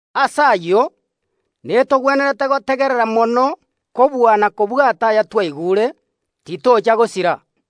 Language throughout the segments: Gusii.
Ase ayio, netogwenerete gotegerera mono kobua na kobwata ayatwaigure, titocha gosira.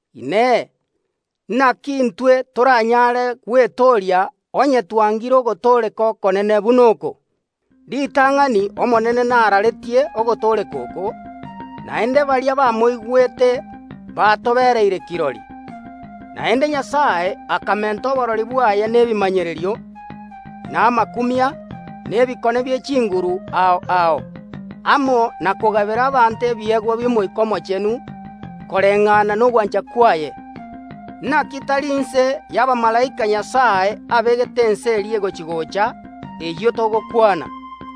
Inee, naki intwe toranyare gwetooria onye twangire ogotooreka okonene buna oko? Ritang’ani Omonene naraaretie ogotooreka oko, naende baria bamoigwete batoenekeirie buna n’eriekeene. Naende Nyasae akamenta oborori bwaye nebimanyererio, na amakumia, na ebikone bie chinguru ao ao amo na kogabera abanto ebiegwa bi’Omoika Omochenu koreng’ana nogwancha kwaye. Naki tari inse y’abamalaika Nyasae abegete Ense eria egochi‐gocha, eyio togokwana.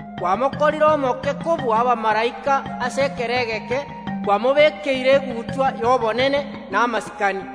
Kwamokorire omoke kobua abamalaika ase ekero egeke, kwamobekeire egutwa y’obonene na amasikani.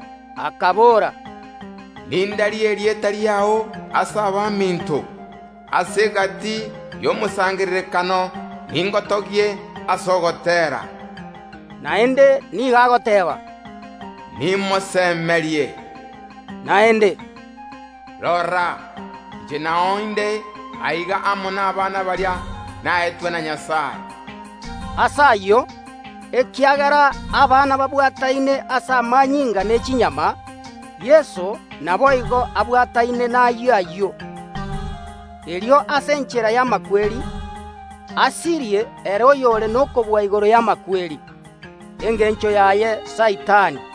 Agateebia Nyasae, “Nindarie erieta riao ase abaminto, ase egati y’omosangererekano ningotogie ase ogoteera.” Naende nigo agoteeba, “Nimosemerie Nyasae.” Naende oteeba, “Rora, inche nao inde aiga amo nabana baria naetwe na Nyasae.” Ase ayio, ekiagera abana buna akobaroka babwataine ase amanyinga ne chinyama, Yeso naboigo abwataine nayio ayio, erio ase enchera y’amakweri asirie ere oyore nokobua igoro y’amakweri, engencho yaye Saitani,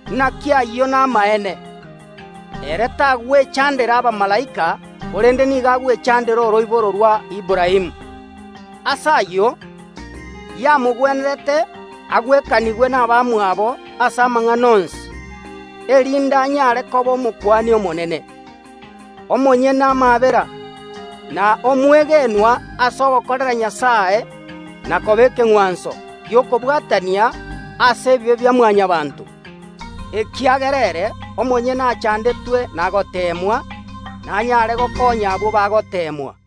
Naki ayio namaene, ere tagwechandera abamalaika, korende nigo agwechandera oroiboro rwa Aburaamu. Ase ayio, yamogwenerete abe buna abamwabo ase amang’ana onsi, erinde anyare koba Omokuani omonene, Omonyene amaabera, na omwegenwa ase ogokorera Nyasae, na koba ekeng’wanso gi’okobwatania ase ebibe bia Mwanyabaanto. Ekiagera ere omonyene achandetwe na goteemwa, nanyare gokonya abwo bagoteemwa.